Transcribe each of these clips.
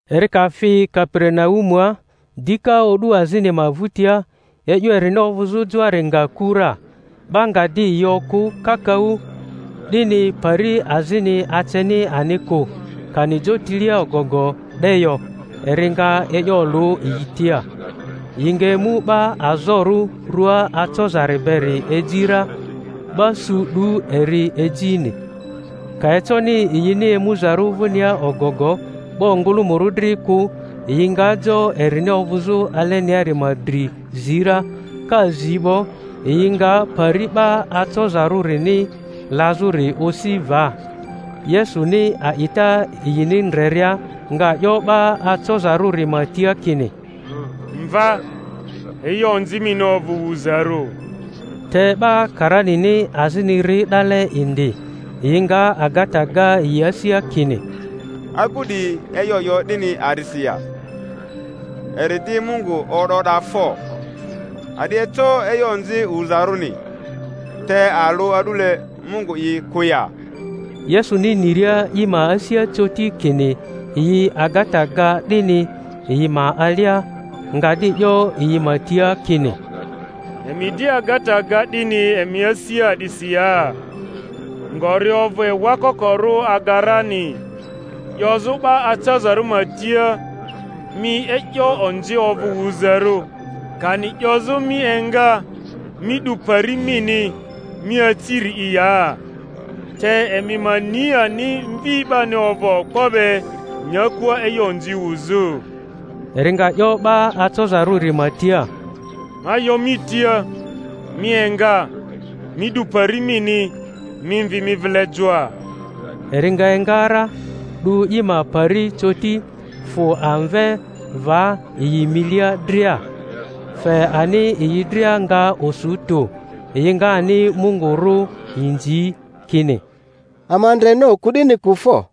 Eri ka fi Kaperinaumua dika o'du azini ma vᴜtia, e'yo erini ovᴜzᴜ joari nga ku ra. 'Ba nga di yi okᴜ kakaᴜ, 'dini pari azini aceni ani kᴜ, kani jotilia ogogo 'de yo; eri nga e'yo olᴜ yi tia. Yi nga emu 'ba azorᴜ rua acozari beri eji ra; 'ba su 'du eri ejini. Ka econi yini emuzarᴜ vᴜnia ogogo 'ba ongᴜlᴜmᴜrᴜ dri kᴜ, yi nga jo erini ovᴜzᴜ aleniari ma dri zi ra; ka zi 'bo, yi nga pari 'ba acozarᴜrini lazᴜri osi va. Yesuni a'ita yini ndreria, nga 'yo 'ba acozarᴜri ma tia kini, Mva, e'yo onzi mini ovᴜ wuzarᴜ. Te 'ba karanini azini ri 'dale indi, yi nga agata ga yi asia kini, Agu 'di e'yo 'yo 'dini a'disi ya? Eri di Mungu o'da o'da fo! A'di eco e'yo onzi wuzarᴜni, te alᴜ a'dule Mungu'i kᴜ ya? Yesuni niria i ma asia coti kini yi agata ga 'dini yi ma alia, nga di 'yo yi ma tia kini, Emi di agata ga 'dini emi asia a'disi ya? Ngori ovᴜ ewa kokorᴜ aga rani, 'yozᴜ 'ba acozarᴜri ma tia, Mi e'yo onzi ovᴜ wuzarᴜ, kani 'yozᴜ, Mi enga, mi 'du pari mini, mi aci-ri’i ya? Te emi ma ni ani Mvi 'bani ovᴜ okpo be nyakua e'yo onzi wuzᴜ —eri nga 'yo 'ba acozarᴜri ma tia— Ma yo mi tia, Mi enga, mi 'du pari mini, mi mvi mi vile joa. Eri nga enga ra, 'du i ma pari coti fᴜ amve va yi milia dria; fe ani yi dria nga osu tᴜ, yi nga ani Mungu rᴜ inzi, kini, Ama ndreni oku 'dini kᴜ fo!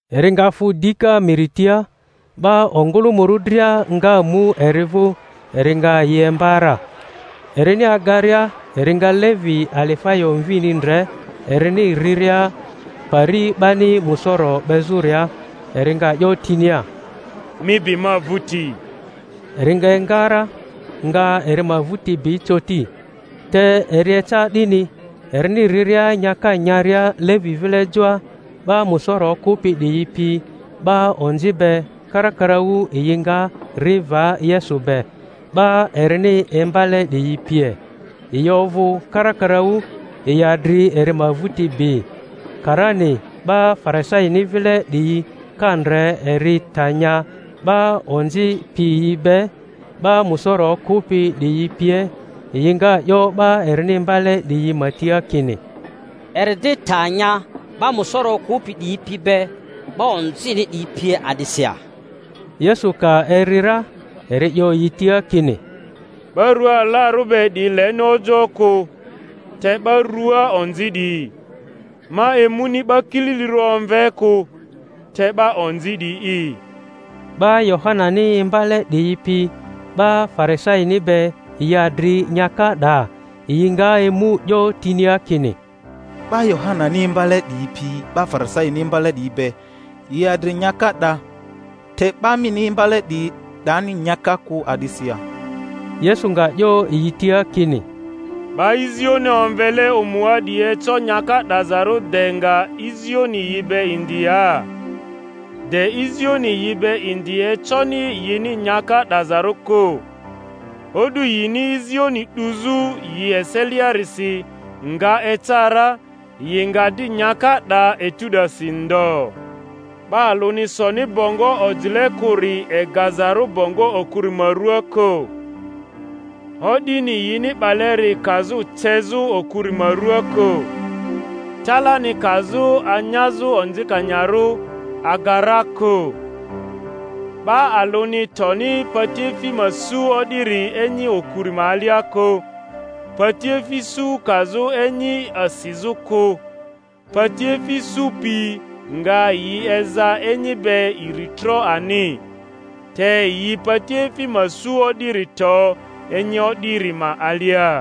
Eri nga fᴜ dika miri tia; 'ba ongᴜlᴜmᴜrᴜ dria nga mu eri vᴜ, eri nga yi imba ra. Erini agaria eri nga Levi Alifayo mvini ndre, erini riria pari 'bani musoro 'bezᴜria, eri nga 'yo tinia, Mi bi ma vᴜti. Eri nga enga ra, nga eri ma vᴜti bi coti. Te eri eca 'dini, erini riria nyaka nyaria Levi vile joa, 'ba musoro okᴜpi diyi pi 'ba onzi be karakaraᴜ yi nga ri va Yesu be, 'ba erini imbale 'diyi pie. Yi ovᴜ karakaraᴜ, yi adri eri ma vᴜti bi. Karani 'ba Farisaini vile 'diyi ka ndre eri ta nya 'ba onzi piyi be, 'ba musoro okᴜpi 'diyi pie, yi nga 'yo 'ba erini imbale 'diyi ma tia kini, Eri di ta nya 'ba musoro okᴜpi 'diyi pi be 'ba onzini pie a'disi ya? Yesu ka eri ra, eri 'yo yi tia kini, 'Ba rua alarᴜ be 'diyi leni ojoᴜ kᴜ, te 'ba rua onzi 'diyi; ma emuni 'ba kililirᴜ omve kᴜ, te 'ba onzi 'diyi'i. 'Ba Yohanani imbale 'diyi pi 'ba Farisaini be yi adri nyaka 'da; yi nga emu 'yo tinia kini, 'Ba Yohanani imbale 'diyi pi 'ba Farisaini imbale 'diyi be, yi adri nyaka 'da, te ‘ba mini imbale 'diyi 'dani nyaka kᴜ a'disi ya? Yesu nga 'yo yi tia kini, 'Ba izioni omvele omua 'diyi eco nyaka 'dazarᴜ de nga izioni yi be indi ya? De izioni yi be indi econi yini nyaka 'dazarᴜ kᴜ. O'du yini izioni 'duzᴜ yi eseliasiri nga eca ra, yi nga di nyaka 'da etu 'dasi ndo. 'Ba alᴜni soni bongo ojile kᴜri egazarᴜ bongo okuri ma ruaa kᴜ, o'dini yini 'baleri kazᴜ cezᴜ okuri ma ruaa kᴜ, talani kazᴜ anyazᴜ onzikanyarᴜ aga ra kᴜ. 'Ba alᴜni toni patiefi ma su o'diri enyi okuri ma alia kᴜ, patiefi su kazᴜ enyi asizᴜ kᴜ, patiefi su pi nga i eza enyi be iri tro ani; te yi patiefi ma su o'diri to enyi o'diri ma alia.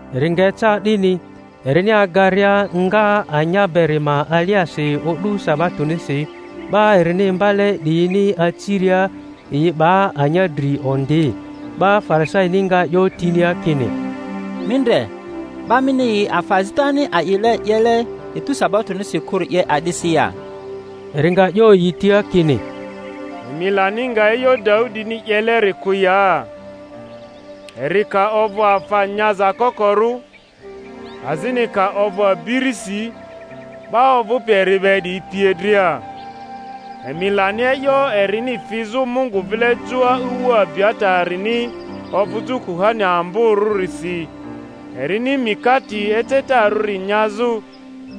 Eri nga eca 'dini, erini agaria nga anya beri ma aliasi o'du sabatonisi, 'ba erini imbale 'diyini aciria yi 'ba anya dri ondi. 'Ba Farisaini nga 'yo tinia kini, Mi ndre, 'ba mini yi afa azitani a'ile 'yele etu sabatonisi kᴜri 'ye a'disi ya? Eri nga 'yo yi tia kini, Emi lani nga e'yo Daudini 'yeleri kᴜ ya? eri ka ovᴜ afa nyaza kokorᴜ, azini ka ovᴜ abirisi, 'ba ovᴜpi eri be 'diyi pie dria. Emi lani e'yo erini fizᴜ Mungu vile joa ewu Abiatarini ovᴜzᴜ kuhani amborᴜrisi, erini mikate ecetarᴜri nyazᴜ,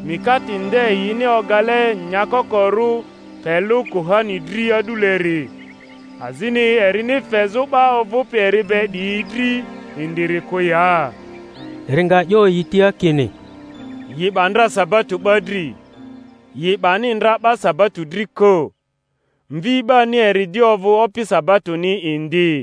mikate nde yini ogale nyakokorᴜ pe lᴜ kuhani dri a'duleri, azini erini fezᴜ 'ba ovᴜpi eri be 'diyi dri indiri kᴜ ya? Eri nga 'yo yi tia kini, Yi 'ba ndra sabato 'ba dri, yi 'bani ndra 'ba sabato dri kᴜ; Mvi 'bani eri di ovᴜ Opi sabatoni indi.